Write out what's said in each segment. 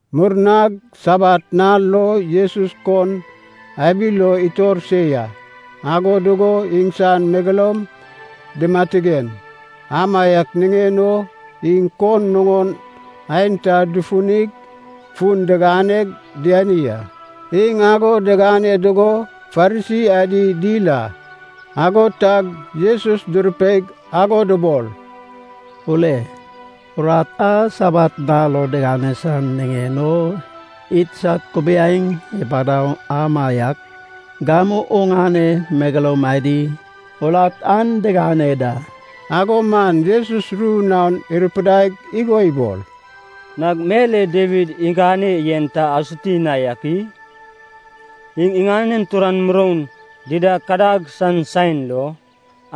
Murnag Sabat nal lo Jesus kon abi lo itor se ya. Ago dugo iŋsan megeloum dimatigen, amaiak niŋen o iŋ kon nuŋon aenta dufunig fun diganeg diani a. Iŋ ago digane dugo Farisi adi dil a, ago tag Jesus durupeig ago dubol, “Ule, urat a Sabat nal lo tigane san niŋen o idsad kubiaeŋ ipadau amaiak, gamu oŋane megeloum adi urat an digane da.” Ago man Jesus ru naon irupidaig igo ibol, “Nag mel e Dawid igane yen ta asuti na ak i? Iŋ iŋanen turan muroun dida kadag san saen lo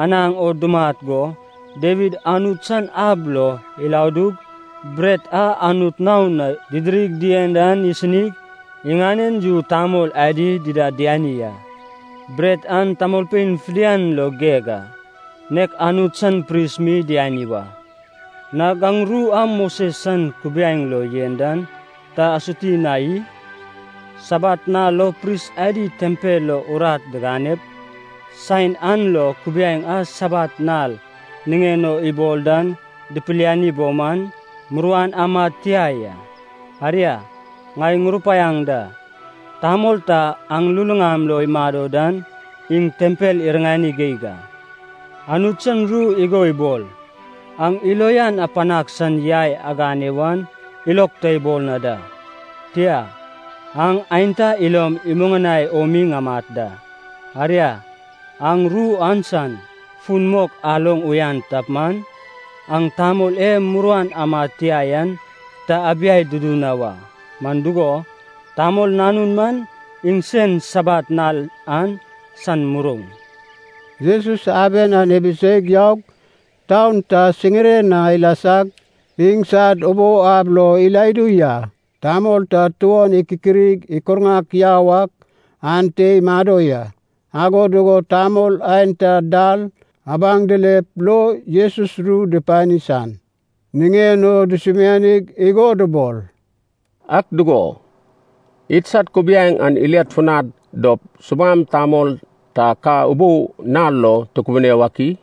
anaŋ o dumat go, Dawid Anut san ab lo iladug, bret a Anut naon na didirig dien an isinig, iŋanen yu tamol adi dida diani a. Bret an tamolpein fidian lo geg a, nek Anut san pris mi diani wa. Nag aŋ ru a Moses san kubiaeŋ lo yen dan ta asuti na i? Sabat nal lo pris adi tempel lo urat diganep, saen an lo kubiaeŋ a Sabat nal niŋen o ibol dan dipilali bo man, muruan amad tia ya. Aria, ŋai ŋurupaiaŋ da, tamol ta aŋ luluŋam lo imado dan iŋ tempel iriŋani geig a. Anut san ru igo ibol, ‘Aŋ ilo uyan apanag san yai agane wan ilog ta ibol na da, tia, aŋ aenta ilom imuŋanai o mi ŋamat da.’ Aria, aŋ ru an san fun mok aloŋ uyan tap man, aŋ tamol e muruan amad tia yan ta abiai dudu na wa. Man dugo, Tamol Nanun man iŋsen Sabat nal an san muroun.” Jesus aben an ibiseig yaug, taun ta siŋiren na ilasag, iŋsad ubou ab lo iladu ya. Tamol ta tuon ikikirig ikurŋak yau ak ante imado ya. Ago dugo tamol aenta dal abaŋ dilep lo Jesus ru dupani san niŋen o dusumianig igo dubol, “Ak dugo, idsad kubiaeŋ an iliad funad dop subam tamol ta ka ubou nal lo tukubune wak i?”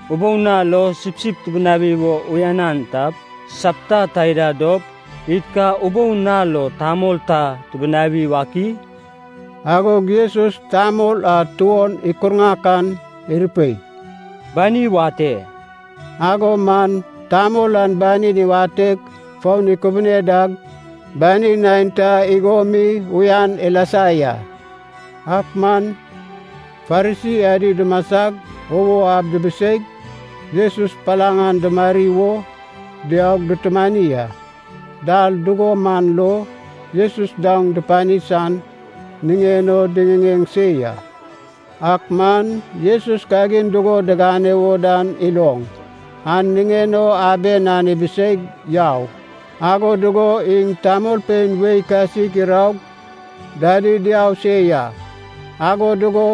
Ubou nal lo sipsip tibinawi wo uyanan tap, sapta taida dop id ka ubou nal lo tamol ta tibinawi wak i?” Agog Jesus tamol a tuon ikurŋak an irupei, “Bani wate.” Ago man tamol an banin iwateg foun ikubune dag banin aenta igo mi uyan ilasa ya. Ak man Farisi adi dumasag ubou ab dibiseig Jesus palaŋ an dumari wo diaug dutumani a. Dal dugo man lo Jesus daoŋ dupani san niŋen o diŋiŋeŋ se ya. Ak man Jesus kagin dugo digane wo dan iloŋ, an niŋen o aben an ibiseig yau. Ago dugo iŋ tamolpein wei kasik iraug dadi diau se ya, ago dugo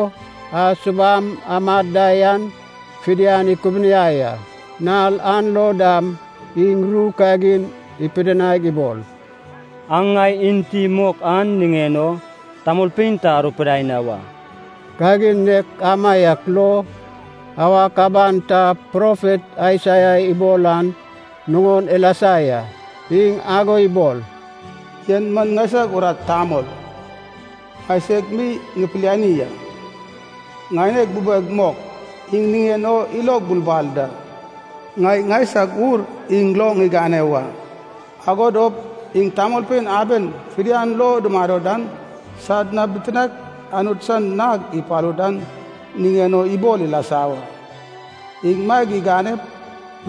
a subam amad da yan fidian ikubuniai a. Nal an lo dam iŋ ru kagin ipidinaig ibol, “Aŋ ŋai enti mok an niŋen o tamolpein ta arupidai na wa.” Kagin nek amaiak lo, awak aban ta profet Aisaia ibol an nuŋon ilasa ya. Iŋ ago ibol, “En man ŋaisag urat tamol, ŋaiseg mi ŋupiliani a, ŋaineg bubeg mok, iŋ niŋen o ilog bulbal da. Ŋai ŋaisag Ur iŋ lo ŋigane wa, agod dop iŋ tamolpein aben fidian lo dumado dan sad na bitinaek Anut san nag ipalu dan niŋen o ibol ilasa wa. Iŋ maeg iganep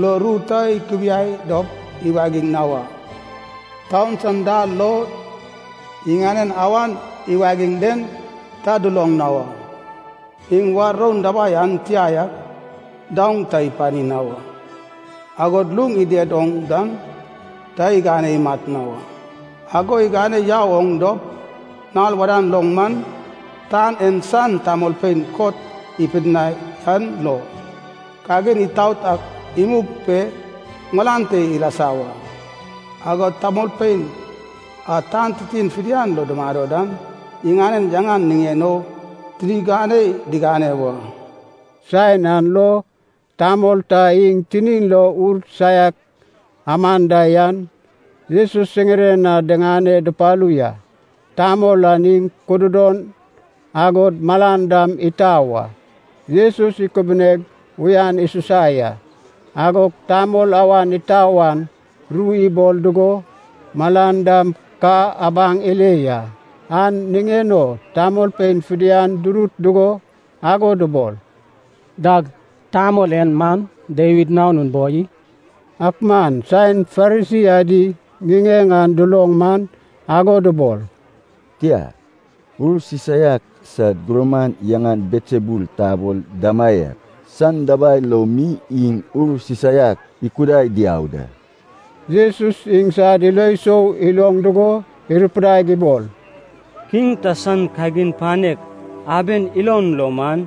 lo ru ta ikubiai dop iwagiŋ na wa. Taun san dal lo iŋanen awan iwagiŋ den ta duloŋ na wa. Iŋ war roun dabai an tia yak daoŋ ta ipani na wa, agod luŋ ided oŋ dan ta igane imat na wa. Ago igane yau oŋ dop, nal wadan lo man, tan en san tamolpein kot ipidinai an lo, kagin itaot an imug pe malan te ilasa wa. Agod tamolpein a tan titin fidian lo dumado dan iŋanen yaŋan niŋen o tini ganei digane wa.” Saen an lo tamol ta iŋ tinin lo ur saiak aman da yan Jesus siŋiren na diŋane dupalu ya. Tamol an iŋ kududon agod malan dam itau a. Jesus ikubineg uyan isusa ya, agog tamol awan itau an ru ibol dugo, malan dam ka abaŋ ile ya. An niŋen o tamolpein fidian durut dugo ago dubol, “Dag tamol en man Dawid Nanun boi i?” Ak man saen Farisi adi ŋiŋeŋ an duloŋ man ago dubol, “Tia, ur sisaiak sad gurman yaŋan Belsebul tabol damaiak, san dabai lo mi iŋ ur sisaiak ikudai diau da.” Jesus iŋsad ilo sou iloŋ dugo irupidaig ibol, “Kiŋ ta san kagin panek aben ilon lo man,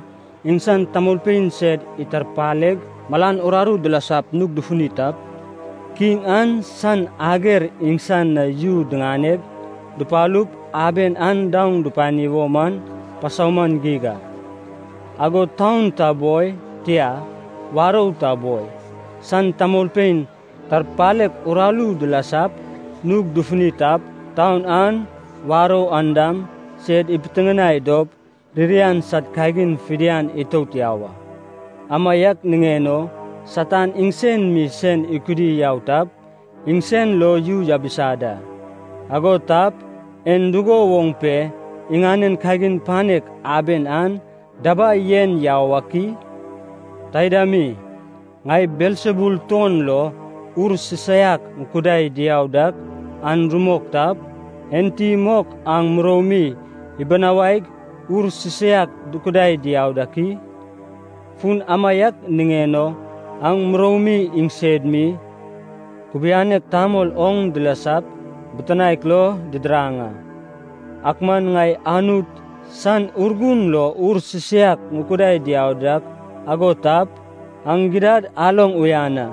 iŋsan tamolpein sed itarpaleg malan ururu dilasap nug dufuni tap, kiŋ an san ager iŋsan na yu diŋane dupalup aben an daoŋ dupani wo man pasauman geig a. Agod taun ta boi, tia, warou ta boi, san tamolpein tarpalek uraru dilasap nug dufuni tap, taun an, warou an dam, sed ipitiŋinai dop ririan sad kagin fidian itout yau a. Amaiak niŋen o Satan iŋsen mi sen ikudi yau tap, iŋsen lo yu yabisa da. Ago tap, en dugo woŋ pe iŋanen kagin panek aben an dabai yen yau ak i? Taida mi, ŋai Belsebul tuon lo ur sisaiak ŋukudai diau dak an rumok tap, enti mok aŋ muroumi ibinawaig ur sisaiak dukudai diau dak i? Fun amaiak niŋen o aŋ muroumi iŋsed mi, kubianek tamol oŋ dilasap bitinaek lo didiraŋ a. Ak man ŋai Anut san Urgun lo ur sisaiak ŋukudai diau dak ago tap, aŋ gidad aloŋ uyan a,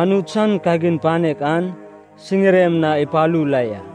Anut san kagin panek an siŋirem na ipalu la ya.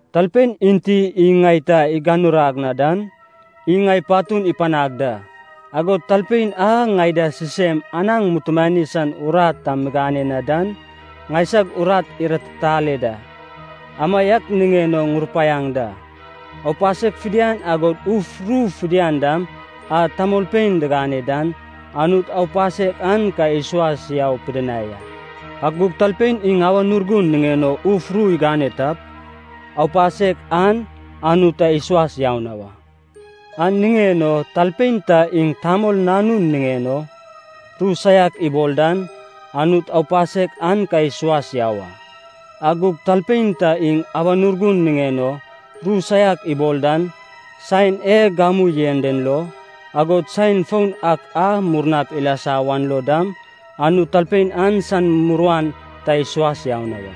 “Talpein enti iŋ ŋai ta iganurag na dan, iŋ ŋai patun ipanag da. Agod talpein a ŋai da sisem anaŋ mutumani san urat ta migane na dan, ŋaisag urat iratitale da. Amaiak niŋen o ŋurupaiaŋ da, aupasek fidian agod uf ru fidian dam a tamolpein digane dan, Anut aupasek an ka isuas yau pidinai a. Ak gug talpein iŋ Awan Urgun niŋen o uf ru igane tap, aupasek an Anut ta isuas yau na wa. An niŋen o talpein ta iŋ Tamol Nanun niŋen o ru saiak ibol dan, Anut aupasek an ka isuas yau a. Ak gug talpein ta iŋ Awan Urgun niŋen o ru saiak ibol dan, saen e gamu yen den lo, agod saen foun ak a murnap ilasa wan lo dam, Anut talpein an san muruan ta isuas yau na wa.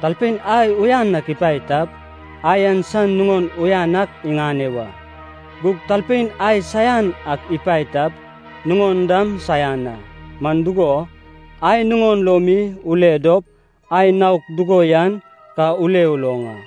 “Talpein ai uyan ak ipae tap, ai an san nuŋon uyan ak iŋane wa. Gug talpein ai saian ak ipae tap, nuŋon dam saian a. Man dugo, ai nuŋon lo mi ule dop, ai naok dugo yan ka ule uloŋ a.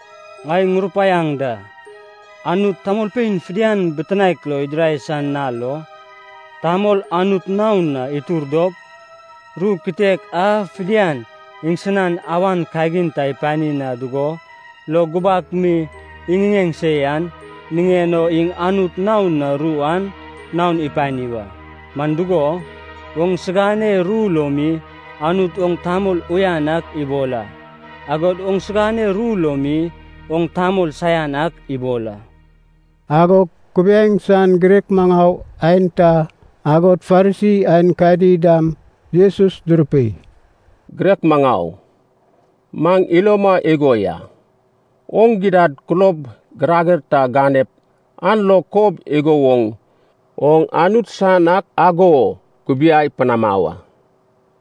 Ŋai ŋurupaiaŋ da, Anut tamolpein fidian bitinaek lo idirai san nal lo, tamol Anut naon na itur dop, ru kitek a fidian iŋsinan awan kagin ta ipani na dugo lo gubak mi iŋiŋeŋ se yan, niŋen o iŋ Anut naon na ru an naon ipani wa. Man dugo, oŋsigane ru lo mi Anut oŋ tamol uyan ak ibol a, agod oŋsigane ru lo mi oŋ tamol saian ak ibol a.” Agog kubiaeŋ san girek maŋau aenta, agod Farisi aenkadi dam Jesus durupei, “Girek maŋau, maŋ iloma igo ya, oŋ gidad kulob girager ta ganep an lo kob igo woŋ oŋ Anut san ak ago kubiai panama wa.”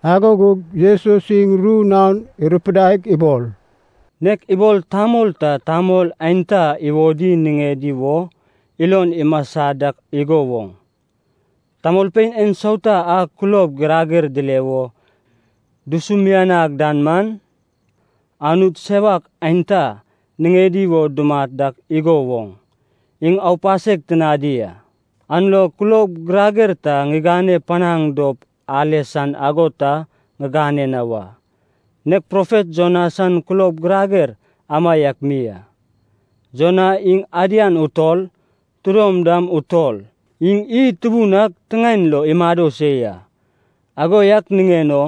Ago gug Jesus iŋ ru naon irupidaig ibol, “Nek ibol tamol ta tamol aenta iwodi niŋedi wo ilon imasa dak igo woŋ, tamolpein ensauta a kulob girager dile wo dusumianag dan man, anut sewak aenta niŋedi wo dumat dak igo woŋ, iŋ aupasek tinadi a. An lo kulob girager ta ŋigane panaŋ dop ale san ago ta ŋigane na wa, nek profet Jona san kulob girager amaiak mi a. Jona iŋ adian utol, tidom dam utol, iŋ iy tubun ak tiŋaen lo imado se ya, ago yak niŋen o,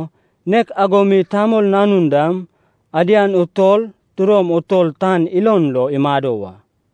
nek ago mi Tamol Nanun dam, adian utol tidom utol tan ilon lo imado wa.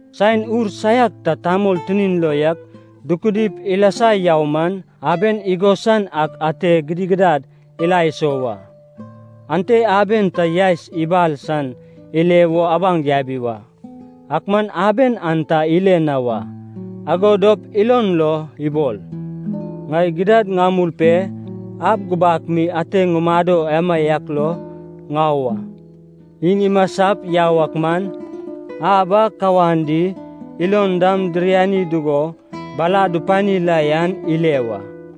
“Saen ur saiak ta tamol tinin lo yak dukudip ilasa yau man, aben igosan ak ate gidigidad ila iso wa. Ante aben ta yaes ibal san ile wo abaŋ yabi wa, ak man aben an ta ile na wa. Ago dop ilon lo ibol, ‘Ŋai gidad ŋamul pe ab gubak mi ate ŋumado amaiak lo ŋau a.’ Iŋ imasap yau ak man, ab an kawan di ilon dam diriani dugo bala dupani la yan ile wa.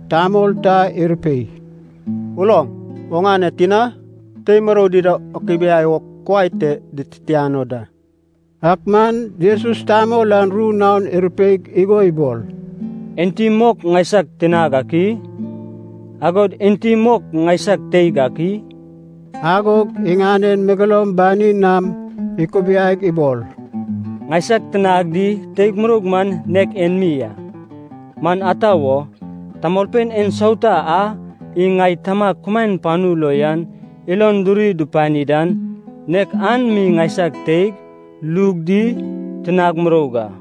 Tamol ta irupei, “Uloŋ, oŋane tina, tei murou dida akubiai o kuai te dititiano da.” Ak man Jesus tamol an ru naon irupeig igo ibol, “Enti mok ŋaisag tinag ak i? Agod enti mok ŋaisag teig ak i?” Agog iŋanen megeloum banin nam ikubiaig ibol, “Ŋaisag tinag di teig muroug man nek en mi a. Man ata wo, tamolpein ensauta a iŋ ŋai Tamag kumaen panu lo yan ilon duri dupani dan, nek an mi ŋaisag teig, lug di tinag muroug a.”